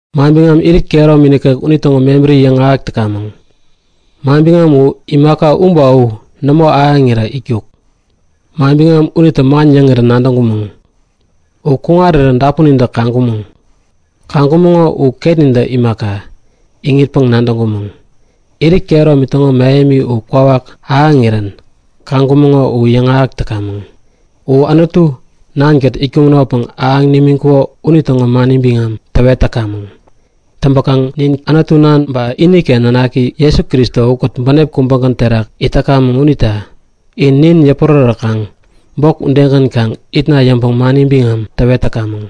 Manbiŋam, irit kehäromi nikek unitäŋo mebärini yäŋahäk täkamäŋ. Manbiŋam u imaka u ba u nämo ahäŋirä itkuk. Manbiŋam unitä man yäŋirän nadäŋkumäŋ. U kuŋarirän dapunintä kaŋkumäŋ. Ba ketnintä imaka, iŋitpäŋ-nadäŋkumäŋ. Irit kehäromi täŋo mähemi u kwawak ahäŋirän kaŋkumäŋo u yäŋahäk täkamäŋ. U Anutu Nankät itkumänopäŋ ahäŋ nimiŋkuko unitäŋo mani biŋam täwet täkamäŋ. Täŋpäkaŋ nin Anutu Nan ba iniken Nanaki Jesu Kristo ukät bänep kubägän terak it täkamäŋ unita in nin yäpurärätkaŋ bok udegän kaŋ itna yäŋpäŋ mani biŋam täwet täkamäŋ.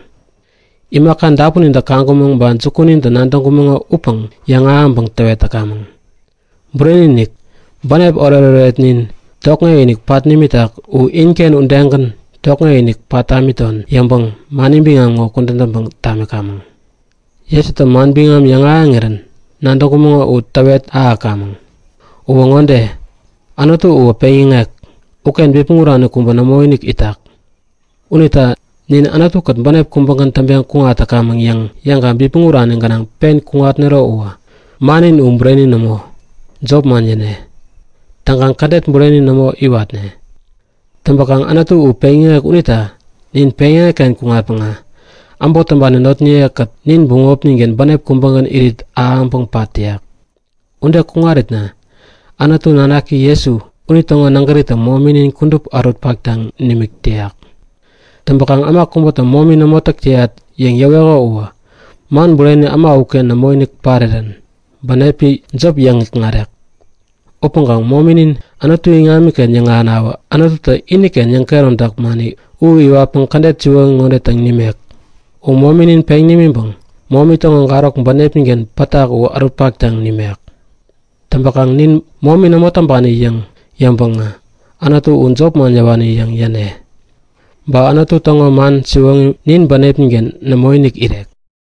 Imaka dapunintä kaŋkumäŋ ba jukunintä nadäŋkumäŋo upäŋ yäŋahäŋpäŋ täwet täkamäŋ. Bureni-inik, bänep oret-oretnin tokŋek-inik pat nimitak u inken udegän tokŋek-inik pat tamiton yäŋpäŋ mani biŋam ŋo kudän täŋpäŋ tamikamäŋ. Jesutä manbiŋam yäŋahäŋirän nadäŋkumäŋo u täwet ahäkamäŋ. Uwä ŋode; Anutu uwä peŋyäŋek. Uken bipmäŋ urani kubä nämoinik itak. Unita nin Anutu-kät bänep kubägän täŋpeŋ kuŋat täkamäŋ yäŋ yäŋkaŋ bipmäŋ urani gänaŋ pen kuŋatnero uwä, mannin u bureni nämo, jopman yäne. Täŋkaŋ kädet bureni nämo iwatne. Täŋpäkaŋ Anutu u peŋyäŋek unita nin peŋyäŋek-ken kuŋatpäŋä, äbot täŋpani notniyekät nin bämopnin-ken bänep kubägän irit ahäŋpäŋ pat täyak. Ude kuŋaritna Anutu nanaki Jesu, unitäŋo nägäritä mominin kudup ärut-paktaŋ nimik täyak. Täŋpäkaŋ äma kubätä momi nämo täk täyat yäŋ yäweko uwä man bureni äma uken nämoinik parirän bänepi jop yäŋ-ikŋarek. Upäŋkaŋ mominin Anutu iŋamiken yäŋahänawä Anututä iniken yäŋkehäromtak mani u iwatpäŋ kädet siwoŋi ŋode täŋ nimek; U mominin peŋ nimiŋpäŋ momi täŋo garok bänepnin-ken pätak u ärut-paktaŋ nimek. Täŋpäkaŋ nin momi nämo täŋpani yäŋ yäŋpäŋä Anutu u jopman yäwani yäŋ yäne. Ba Anutu täŋo man siwoŋi nin bänepnin-ken nämoinik irek.